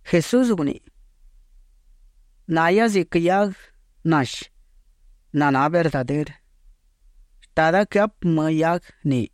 Jesús guniꞌi: ―Nahia ziquë hiaguë nashi naná verdadërë. Shtada quëhapë më hiaguë ni.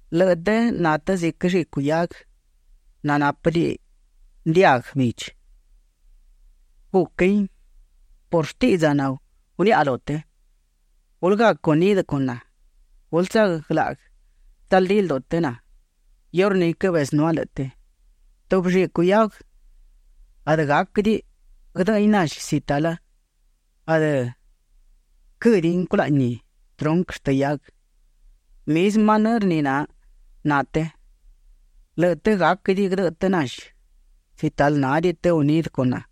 Lëꞌë të na të ziquë llicu hiaguë nanápëdiꞌi ndiaguë bidchi. Guquin por shtiꞌdza naguniaꞌa lu të. Gulë gac unidë con na. Gulë tsaglaꞌguë tsaldí lduꞌu të na, iurní quëbezënúa lëꞌë të. Tubi llicu hiaguë adë gáquëdiꞌi guëdëꞌëin nashi si talë adë quë́diꞌin culaꞌni trunquë shtë hiaguë. Mizmë manërë ni na të. Lëꞌë të gáquëdiꞌi guëdëꞌë të nashi si talë nádiꞌi të unidë con na.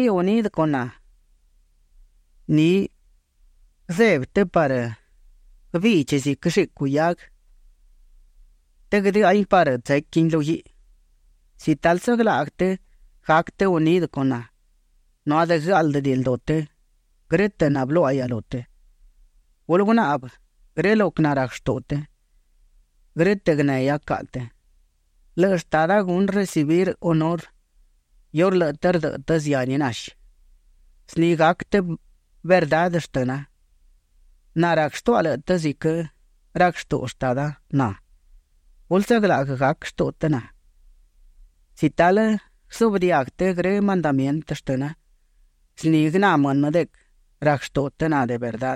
El quë nádiꞌi unidë con na, ni guëzebi të parë guëbidchi ziquë llicu hiaguë të guëdëahin parë tsequin lu guiꞌi. ’Si talë tsaglaꞌguë të, gac të unidë con na, nu adë guëáꞌldëdiꞌi lduꞌu të grë́tëꞌ nabëluáꞌahia lu të. Gulë gunaꞌbë grë lo quë narac shtuꞌu të, grë́tëꞌ guënehia caꞌa të. Lëꞌë Shtada gunë recibir hunurë iurë lëꞌë të rdëꞌë të zihani nashi. Zni gac të de verdá shmëna. Na rac shtuaꞌa lëꞌë të ziquë rac shtuꞌu Shtada na. Gulë tsaglaꞌguë gac shtuꞌu të na. Si talë guëzuꞌbë diaguë të grë mandamientë shtëna, zni guëná mënë de quë rac shtuꞌu të na de verdá.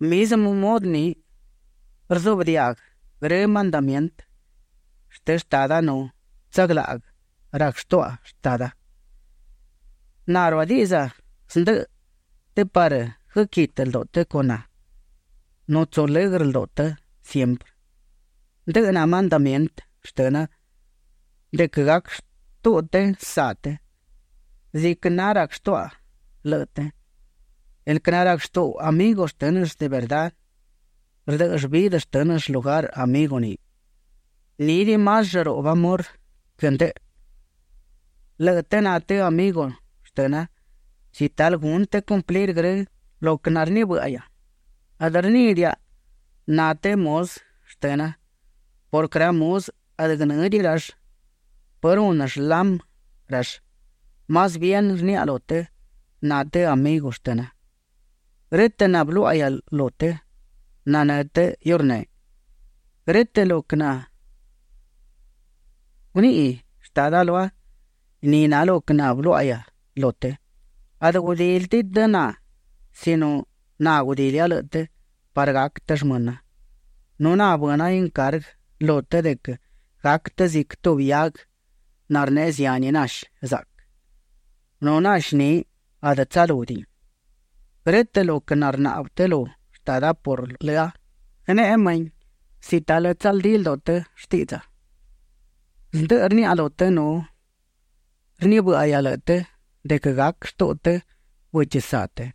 Mizmë mudë ni rzuꞌbë diaga grë mandamientë shtë Shtada nu tsaglaꞌguë rac shtuaꞌa Shtada. ’Na ruadiꞌdza zndëꞌë të parë guëquitë lduꞌu të con na nu tsu lëgrë lduꞌu të siemprë. Ndëꞌë na mandamientë shtëna de quë gac shtuꞌu të saꞌ të ziquë na rac shtuaꞌa lëꞌë të. El quë narac shtuꞌu amigu shtë́nëll de verdá, rdë́ꞌëll vidë shtë́nëll shlugar amigu ni. Nídiꞌi más llëruꞌbë amor quë ndëꞌë. Lëꞌë të na të amigu shtëna si talë gunë të cumplir grë́tëꞌ lo quë narnibë́ꞌahia. Adë rníꞌidiaꞌa na të muzë shtëna purquë ra muzë adë guënë́diꞌi rall pë runë shlamë rall; más bien rniaꞌa lu të na të amigu shtëna. Grë́tëꞌ nabëluáꞌahia lu të, nanë́ të iurneꞌ. Grë́tëꞌ lo quë naguniꞌi Shtada lua, ni na lo quë nabëluáꞌahia lu të. Adë gudílidiꞌi të na sino na gudilia lëꞌë të parë gac të shmëna, nu na bëna incarguë lu të de quë gac të ziquë tubi hiaguë narneꞌe zihani nashi zaꞌquë nu nashi ni adë tsalúdiꞌin. Grë́tëꞌ lo quë narnaꞌbë të lu Shtada por lëa, guëneꞌe mëhin si talë tsaldí lduꞌu të shtiꞌdza. Zndë rniaꞌa lu të nu rnibë́ꞌahia lëꞌë të de quë gac shtuꞌu të bëchi saꞌ të.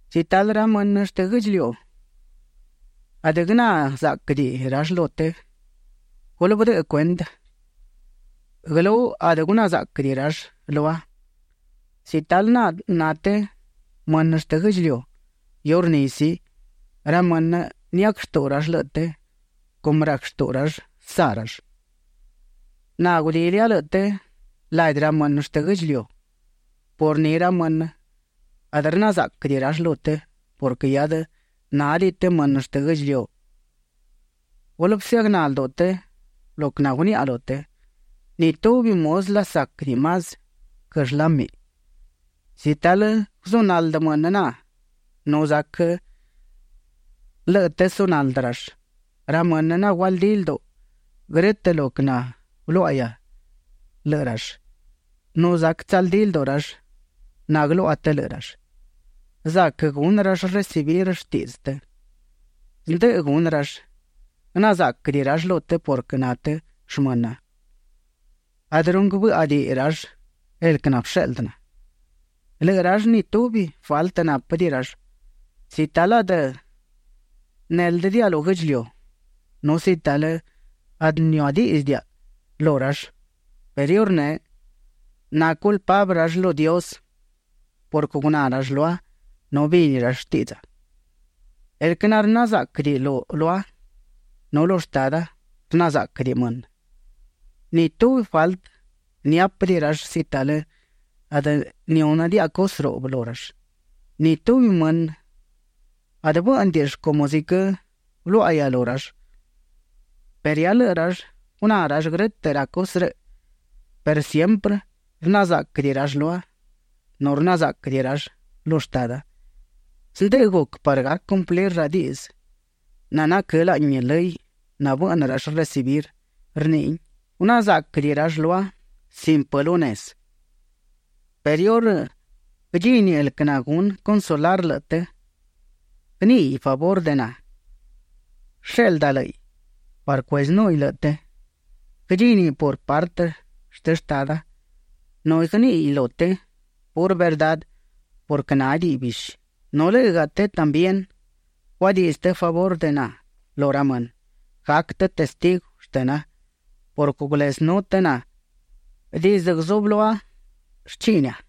’Si talë ra mënë shtë guë́ꞌdchiliu, adë guëná záꞌquëdiꞌi rall lu të, gulë bëdëꞌë cuendë guëlú adë guná záꞌquëdiꞌi rall lua. Si talë na të mënë shtë guë́ꞌdchiliu, iurní sí, ra mënë niac shtuꞌu rall lëꞌë të cumë rac shtuꞌu rall saꞌ rall. Na gudilia lëꞌë të ladi ra mënë shtë guë́ꞌdchiliu, por ni ra mënë adë rna záꞌquëdiꞌi rall lu të purquë hiadë nádiꞌi të mënë shtë guë́ꞌdchiliu. Gulë bësëagná lduꞌu të lo quë naguniaꞌa lu të: “Ni tubi muzë lasáquëdiꞌi más quë shlámiꞌ”. Si talë guzunaldë mënë na, nu zac lëꞌë të sunaldë rall. Ra mënë nagualdí lduꞌu grë́tëꞌ lo quë nabëluáꞌahia lëꞌë rall; nu zac tsaldí lduꞌu rall naguëluaꞌa të lëꞌë rall, zac gunë rall recibir shtiꞌdzë të. Zndëꞌë gunë rall. Guëná záꞌquëdiꞌi rall lu të purquë na të shmëna. Adë runguë bë́ꞌadiꞌi rall el quë nabësheꞌldë na. ’Lëꞌë rall ni tubi faltë nápëdiꞌi rall si talë adë néldëdiaꞌa lu guë́ꞌdchiliu nu si talë adë niuadíꞌdzëdiaꞌa lu rall, perë iurneꞌ naculpablë rall lu Dios purquë guná rall lua nu bini rall shtiꞌdza. El quë narná záꞌquëdiꞌi lua, nu lu Shtada rna záꞌquëdiꞌi mënë. Ni tubi faltë niápëdiꞌi rall si talë adë nihúnëdiaꞌa cusë ruꞌbë lu rall. Ni tubi mënë adë bë́ꞌnëdiꞌill cumë ziquë bëluáꞌahia lu rall, perë hia lëꞌë rall guná rall grë́tëꞌ ra cusë rëꞌ perë siemprë rna záꞌquëdiꞌi rall lua nu rna záꞌquëdiꞌi rall lu Shtada. Zndëꞌë guc parë gac cumplir ra diꞌdzë nanaquë́ laꞌni lëy nabëꞌnë rall recibir. Rniꞌin: “Guná záꞌquëdiꞌi rall lua sin pë lu nezë”. ’Perë iurë guëdchini el quë nagunë consolar lëꞌë të, guëníꞌiꞌ favurë de na. Guësheꞌlda lë́ꞌiꞌ parë cuezënúhiꞌ lëꞌë të. Guëdchíniꞌ por partë shtë Shtada nu guëníꞌiꞌ lu të purë verdá purquë nádiꞌiꞌ bishi. Nu lë́ꞌëgaꞌa të también guadiꞌdzë të favurë de na lu ra mënë; gac të testigu shtëna purquë gulezënú të na dizdë guzublúa shchiꞌnia.